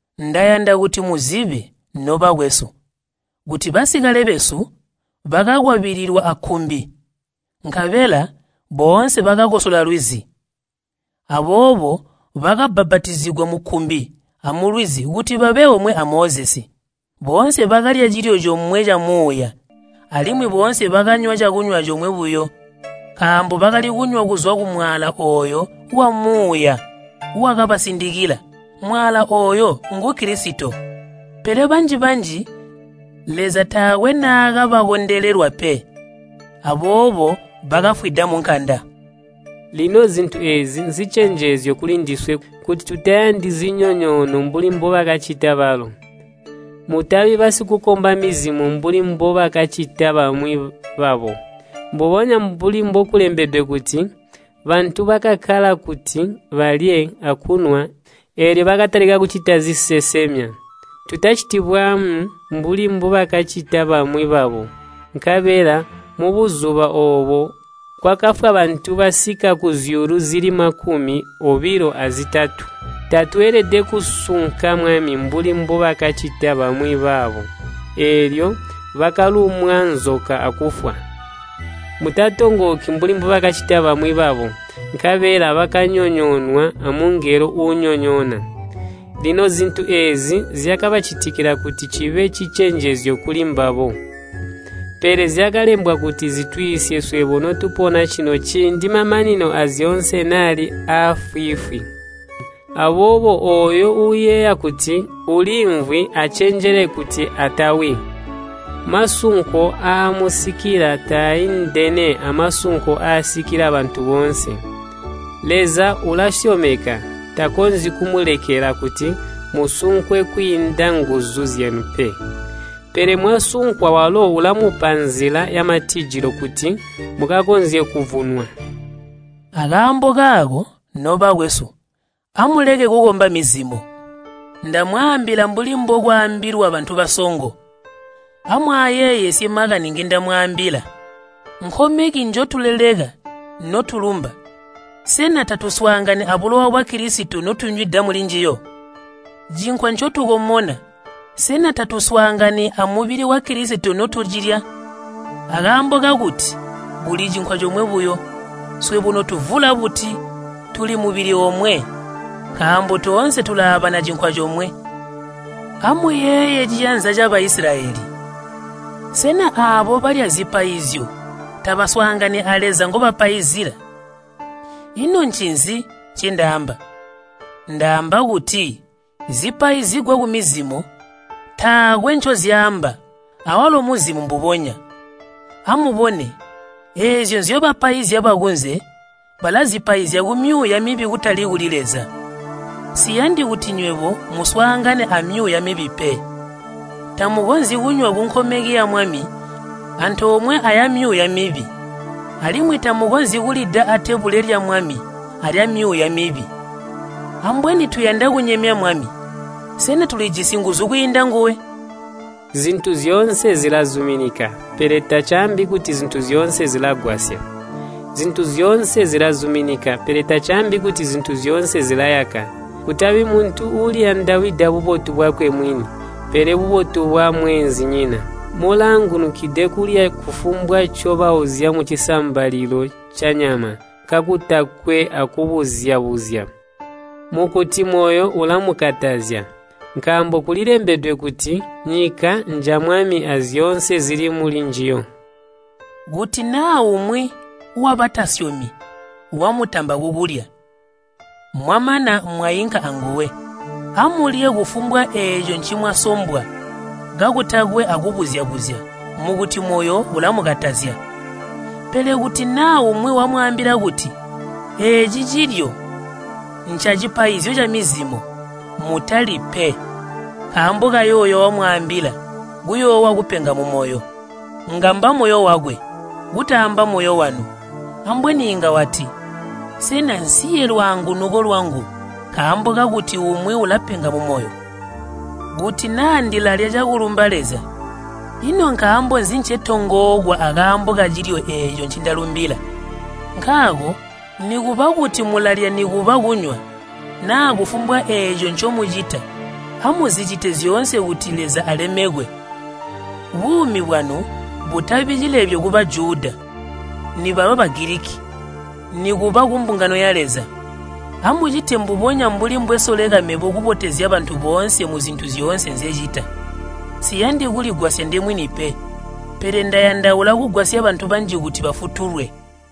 Ndayanda kuti muzibe, nobakwesu, kuti basikale besu bakakwabililwa akkumbi, nkabela boonse bakakosola lwizi. Aboobo bakabbapatizigwa mukkumbi amulwizi kuti babe omwe a Mozesi. Boonse bakalya cilyo comwe camuuya, alimwi boonse bakanywa cakunywa comwe buyo. Nkaambo bakali kunywa kuzwa kumwaala ooyo wamuuya wakabasindikila, mwaala ooyo ngu Kilisito. Pele banji-banji Leza taakwe naakabakondelelwa pe, aboobo bakafwida munkanda. Lino zintu eezi nzicenjezyo kulindiswe, kuti tutayandi zinyonyoono mbuli mbubakacita balo. Mutabi basikukomba mizimo mbuli mbubakacita bamwi babo, mbubonya mbuli mbokulembedwe kuti, “Bantu bakakkala kuti balye akunywa, eelyo bakatalika kucita zisesemya.” Tutaciti bwaamu mbuli mbubakacita bamwi babo. Nkabela mubuzuba oobo kwakafwa bantu basika kuzyuulu zili makumi obilo azitatu. Tatweelede kusunka Mwami mbuli mbubakacita bamwi babo, eelyo bakalumwa nzoka akufwa. Mutatongooki mbuli mbubakacita bamwi babo, nkabela bakanyonyoonwa amungelo uunyonyoona. Lino zintu eezi zyakabacitikila kuti cibe cicenjezyo kuli mbabo, pele zyakalembwa kuti zitwiisye swebo notupona cino ciindi mamanino aazyoonse naali afwiifwi. Aboobo ooyo uuyeeya kuti uliimvwi acenjele kuti atawi. Masunko aamusikila taaindene amasunko aasikila bantu boonse. Leza ulasyomeka, takonzyi kumulekela kuti musunkwe kwiinda nguzu zyanu pe. Pele mwasunkwa, walo ulamupa nzila yamatijilo, kuti mukakonzye kuvunwa. Akaambo kaako, nobakwesu, amuleke kukomba mizimo. Ndamwaambila mbuli mbokwaambilwa bantu basongo, amwaayeeyesye makani ngindamwaambila. Nkomeki njotuleleka notulumba, sena tatuswaangani abulowa bwa Kilisito notunywida mulinjiyo? Cinkwa ncotukomona, sena tatuswaangani amubili wa Kilisito notucilya? Akaambo kakuti kuli cinkwa comwe buyo, swebo notuvula buti tuli mubili omwe, nkaambo toonse tulaabana cinkwa comwe. Amuyeeye ciyanza ca Baisilayeli. Sena aabo balya zipaizyo tabaswaangani a Leza ngobapaizila? Ino ncinzi ncendaamba? Ndaamba kuti zipaizigwa kumizimo taakwe ncozyaamba awalo muzimo mbubonya. Amubone, eezyo nzyobapaizya bakunze, balazipaizya kumyuuya mibi kutali kuli Leza. Nsiyandi kuti nywebo muswaangane amyuuya mibi pe. Tamukonzyi kunywa munkomeki ya Mwami antoomwe ayamyuuya mibi. Alimwi tamukonzyi kulida atebule lya Mwami alyamyuuya mibi. Ambweni tuyanda kunyemya Mwami? Sena tulijisi nguzu kwiinda nguwe? “Zintu zyoonse zilazuminika,” pele tacaambi kuti zintu zyoonse zilagwasya. “Zintu zyoonse zilazuminika,” pele tacaambi kuti zintu zyoonse zilayaka. Kutabi muntu uuliyandawida bubotu bwakwe mwini, pele bubotu bwamweenzinyina. Mulaangunukide kulya kufumbwa ncobauzya mucisambalilo canyama kakutakwe akubuzya-buzya mukuti moyo ulamukatazya. Nkaambo kulilembedwe kuti, “Nyika nja Mwami azyoonse zili mulinjiyo.” Kuti naa umwi wabatasyomi wamutamba kukulya, mwamana mwainka anguwe, amulye kufumbwa eeco ncimwasombwa kakutakwe akubuzya-buzya mukuti moyo ulamukatazya. Pele kuti naa umwi wamwaambila kuti, “Eeci cilyo ncacipaizyo camizimo,” mutalyi pe, nkaambo kayooyo wamwaambila kuyoowa kupenga mumoyo. Ngamba moyo wakwe, kutaamba moyo wanu. Ambweni inga wati, “Sena nsiye lwaangunuko lwangu nkaambo kakuti umwi ulapenga mumoyo? Kuti naa ndilalya cakulumba Leza, ino nkaambo nzi ncetongookwa akaambo kacilyo eeco ncindalumbila?” Nkaako nikuba kuti mulalya nikuba kunywa, naa kufumbwa eeco ncomucita, amuzicite zyoonse kuti Leza alemekwe. Buumi bwanu butabi cilebyo ku Bajuda, nibaba Bagiliki, nikuba kumbungango ya Leza. Amucite mbubonya mbuli mbwesoleka mebo kubotezya bantu boonse muzintu zyoonse nzecita. Nsiyandi kuligwasya ndemwini pe, pele ndayandaula kugwasya bantu banji kuti bafutulwe.